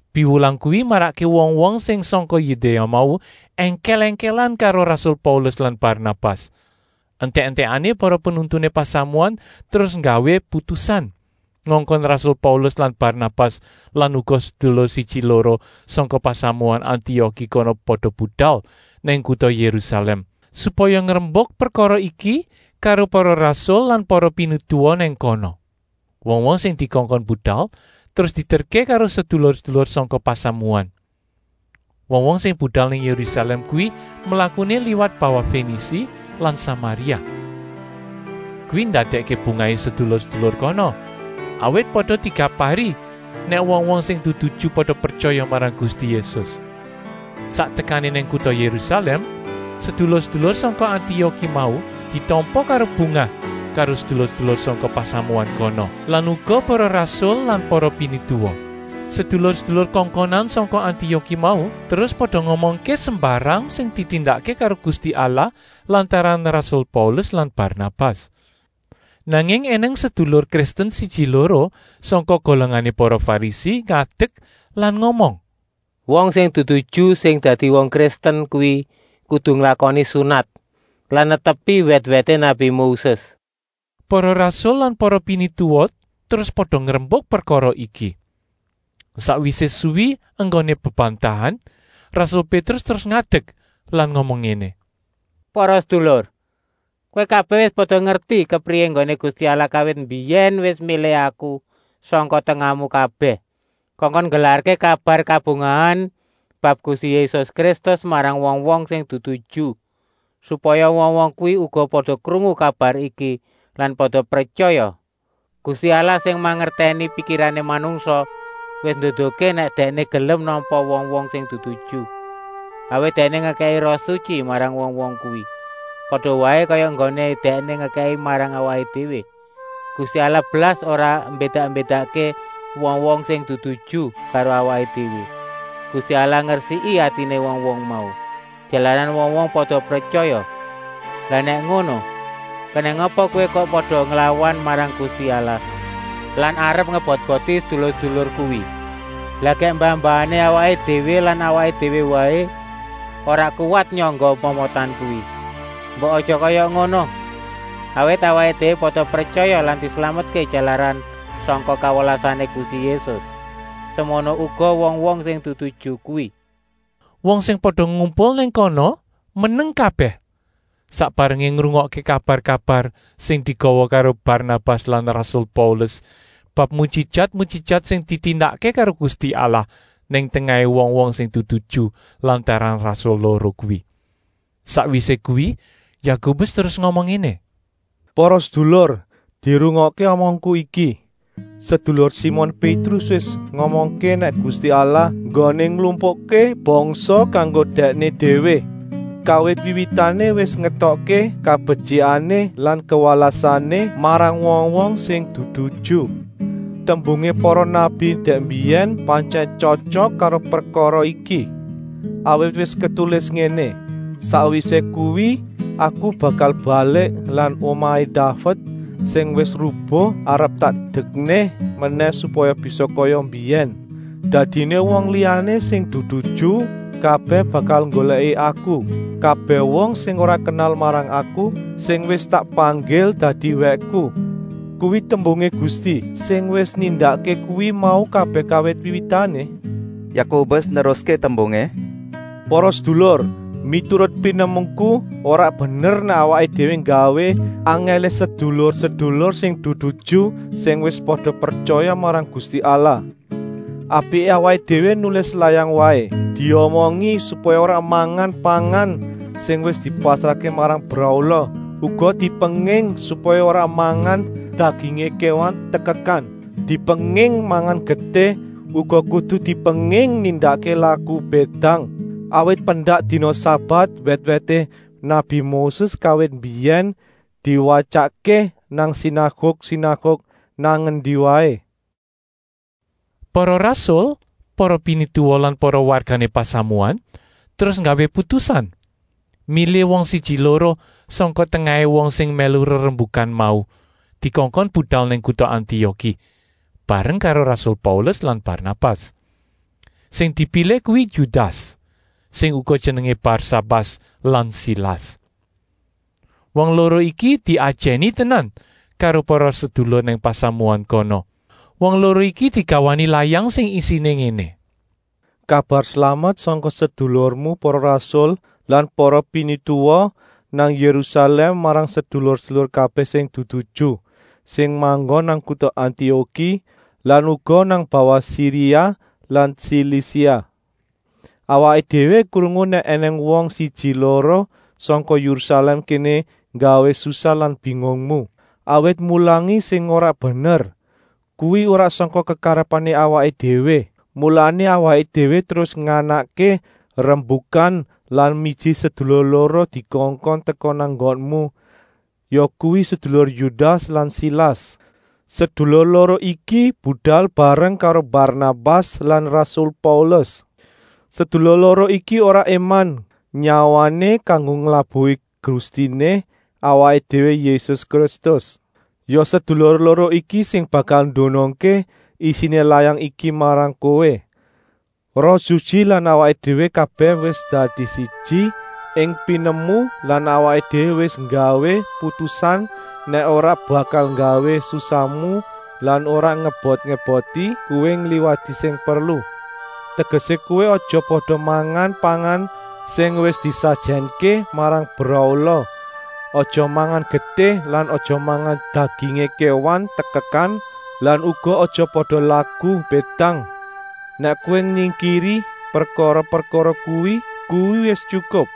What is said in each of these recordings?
Piwulang kuwi marakké wong-wong sing sangka Yudéa mau èngkèl-èngkèlan karo rasul Paulus lan Barnabas. Entèk-entèkané para penuntuné pasamuan terus nggawé putusan ngongkon rasul Paulus lan Barnabas lan uga sedulur siji-loro sangka pasamuan Antioki kono pada budal nang kuta Yérusalèm, supaya ngrembuk prekara iki karo para rasul lan para pinituwa nang kana. Wong-wong sing dikongkon budal terus dieterké karo sedulur-sedulur sangka pasamuan. Wong-wong sing budal nang Yérusalèm kuwi mlakuné liwat bawah Fenisi lan Samaria. Kuwi ndadèkké bungahé sedulur-sedulur kono, awit pada dikabari nèk wong-wong sing dudu Ju pada pretyaya marang Gusti Yésus. Sak tekané nang kuta Yérusalèm sedulur-sedulur sangka Antioki mau ditampa karo bungah karo sedulur-sedulur sangka pasamuan kono lan uga para rasul lan para pinituwa. Sedulur-sedulur kongkonan sangka Antioki mau terus pada ngomongké sembarang sing ditindakké karo Gusti Allah lantaran rasul Paulus lan Barnabas. Nanging ènèng sedulur Kristen siji-loro sangka golongané para Farisi ngadek lan ngomong: “Wong sing dudu Ju sing dadi wong Kristen kuwi kudu nglakoni sunat lan netepi wèt-wèté nabi Moses!” Para rasul lan para pinituwa terus pada ngrembuk prekara iki. Sakwisé suwi enggoné bebantahan, rasul Pétrus terus ngadek lan ngomong ngéné: “Para sedulur! Kowé kabèh wis pada ngerti kepriyé enggoné Gusti Allah kawit mbiyèn wis milih aku sangka tengahmu kabèh, kongkon nggelarké kabar kabungahan bab Gusti Yésus Kristus marang wong-wong sing dudu Ju, supaya wong-wong kuwi uga pada krungu kabar iki lan pada pretyaya. Gusti Allah sing mangertèni pikirané manungsa wis nduduhké nèk Dèkné gelem nampa wong-wong sing dudu Ju, awit Dèkné ngekèki Roh Sutyi marang wong-wong kuwi, pada waé kaya enggoné Dèkné ngekèki marang awaké déwé. Gusti Allah blas ora mbédak-mbédakké wong-wong sing dudu Ju karo awaké déwé. Gusti Allah ngresiki atiné wong-wong mau, jalaran wong-wong pada pretyaya. Lah nèk ngono, kenèng apa kowé kok pada nglawan marang Gusti Allah lan arep ngebot-eboti sedulur-sedulur kuwi? Lah gèk mbah-mbahané awaké déwé lan awaké déwé waé ora kuwat nyangga momotan kuwi. Mbok aja kaya ngono! Awit awaké déwé pada pretyaya lan dislametké jalaran sangka kawelasané Gusti Yésus, semono uga wong-wong sing dudu Ju kuwi!” Wong sing pada ngumpul nang kono meneng kabèh sak barengé ngrungokké kabar-kabar sing digawa karo Barnabas lan rasul Paulus bab mujijat-mujijat sing ditindakké karo Gusti Allah nang tengahé wong-wong sing dudu Ju lantaran rasul loro kuwi. Sakwisé kuwi Yakobus terus ngomong ngéné: “Para sedulur, dirungokké omongku iki. Sedulur Simon Pétrus wis ngomongké nèk Gusti Allah enggoné nglumpukké bangsa kanggo Dèkné déwé, kawit wiwitané wis ngétokké kabetyikané lan kawelasané marang wong-wong sing dudu Ju. Tembungé para nabi dèk mbiyèn pantyèn tyotyok karo prekara iki. Awit wis ketulis ngéné: ‘Sakwisé kuwi aku bakal balik lan omahé Daved sing wis rubuh arep tak dekné menèh supaya bisa kaya mbiyèn. Dadiné wong liyané sing dudu Ju kabèh bakal nggolèki Aku, kabèh wong sing ora kenal marang Aku, sing wis tak panggil dadi wèkku. Kuwi tembungé Gusti, sing wis nindakké kuwi mau kabèh kawit wiwitané!’” Yakobus neruské tembungé: “Para sedulur, miturut pinemuku, ora bener nèk awaké déwé nggawé angèlé sedulur-sedulur sing dudu Ju sing wis pada pretyaya marang Gusti Allah. Apiké awaké déwé nulis layang waé, diomongi supaya ora mangan pangan sing wis dipasrahké marang brahala; uga dipenging supaya ora mangan dagingé kéwan tekekan; dipenging mangan getih; uga kudu dipenging nindakké laku bédang. Awit pendak dina sabat wèt-wèté nabi Moses kawit mbiyèn diwatyakké nang sinaguk-sinaguk nang endi waé.” Para rasul, para pinituwa lan para wargané pasamuan terus nggawé putusan milih wong siji-loro sangka tengahé wong sing mèlu rerembukan mau, dikongkon budal nang kuta Antioki, bareng karo rasul Paulus lan Barnabas. Sing dipilih kuwi Yudas, sing uga jenengé Barsabas lan Silas. Wong loro iki diajèni tenan karo para sedulur nang pasamuan kono. Wong loro iki digawani layang sing isiné ngéné: Kabar slamet sangka sedulurmu para rasul lan para pinituwa nang Yérusalèm marang sedulur-sedulur kabèh sing dudu Ju, sing manggon nang kuta Antioki lan uga nang bawah Siria lan Silisia. Awaké déwé krungu nèk ènèng wong siji-loro sangka Yérusalèm kéné nggawé susah lan bingungmu, awit mulangi sing ora bener. Kuwi ora sangka kekarepané awaké déwé. Mulané awaké déwé terus nganakké rembukan lan miji sedulur loro dikongkon teka nang nggonmu, yakuwi sedulur Yudas lan Silas. Sedulur loro iki budal bareng karo Barnabas lan rasul Paulus. Sedulur loro iki ora éman nyawané kanggo nglabuhi Gustiné awaké déwé Yésus Kristus. Ya sedulur loro iki sing bakal ndunungké isiné layang iki marang kowé. Roh Sutyi lan awaké déwé kabèh wis dadi siji ing pinemu lan awaké déwé wis nggawé putusan nèk ora bakal nggawé susahmu lan ora ngebot-eboti kowé ngliwati sing perlu. Tegesé, kowé aja pada mangan pangan sing wis disajènké marang brahala, aja mangan getih lan aja mangan dagingé kéwan tekekan lan uga aja pada laku bédang. Nèk kowé nyingkiri prekara-prekara kuwi, kuwi wis tyukup.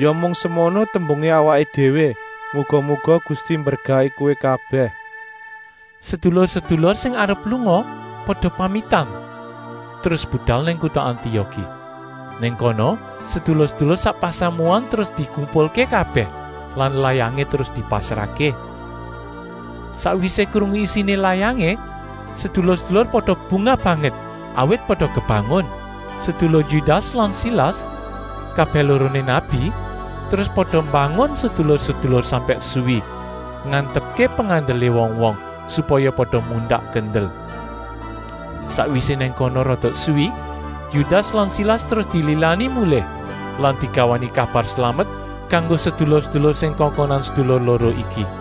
Ya mung semono tembungé awaké déwé, muga-muga Gusti mberkahi kowé kabèh! Sedulur-sedulur sing arep lunga pada pamitan terus budal nang kuta Antioki. Nang kono sedulur-sedulur sak pasamuan terus dikumpulké kabèh lan layangé terus dipasrahké. Sakwisé krungu isiné layangé, sedulur-sedulur pada bungah banget, awit pada kebangun. Sedulur Yudas lan Silas, kabèh loroné nabi, terus pada mbangun sedulur-sedulur sampèk suwi, ngantepké pengandelé wong-wong, supaya pada mundak kendel. Sakwisé nang kono rada suwi, Yudas lan Silas terus dililani mulih lan digawani kabar slamet kanggo sedulur-sedulur sing kongkonan sedulur loro iki.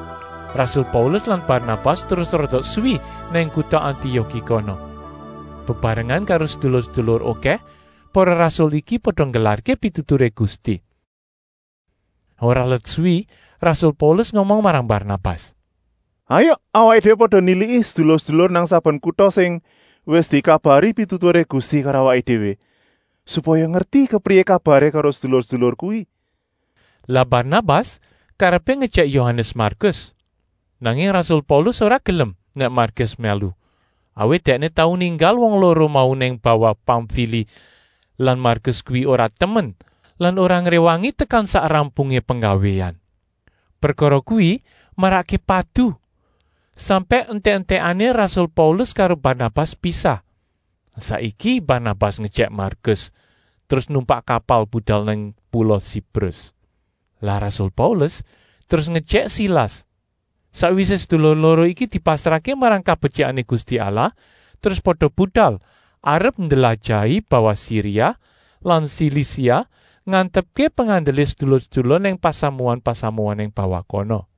Rasul Paulus lan Barnabas terus rada suwi nang kuta Antioki kono. Bebarengan karo sedulur-sedulur okèh para rasul iki pada nggelarké pituturé Gusti. Ora let suwi rasul Paulus ngomong marang Barnabas: “Hayuk awaké déwé pada niliki sedulur-sedulur nang saben kuta sing wis dikabari pituturé Gusti karo awaké déwé, supaya ngerti kepriyé kabaré karo sedulur-sedulur kuwi.” Lah Barnabas karepé ngejèk Yohanes Markus. Nanging rasul Paulus ora gelem nèk Markus mèlu, awit dèkné tau ninggal wong loro mau nang bawah Pamfili lan Markus kuwi ora temen lan ora ngréwangi tekan sak rampungé penggawéan. Prekara kuwi marakké padu, sampèk entèk-entèkané rasul Paulus karo Barnabas pisah. Saiki Barnabas ngejèk Markus, terus numpak kapal budal nang pula Siprus. Lah rasul Paulus terus ngejèk Silas. Sakwisé sedulur loro iki dipasrahké marang kabetyikané Gusti Allah terus pada budal arep ndlajahi bawah Siria lan Silisia, ngantepké pengandelé sedulur-sedulur nang pasamuan-pasamuan nang bawah kono.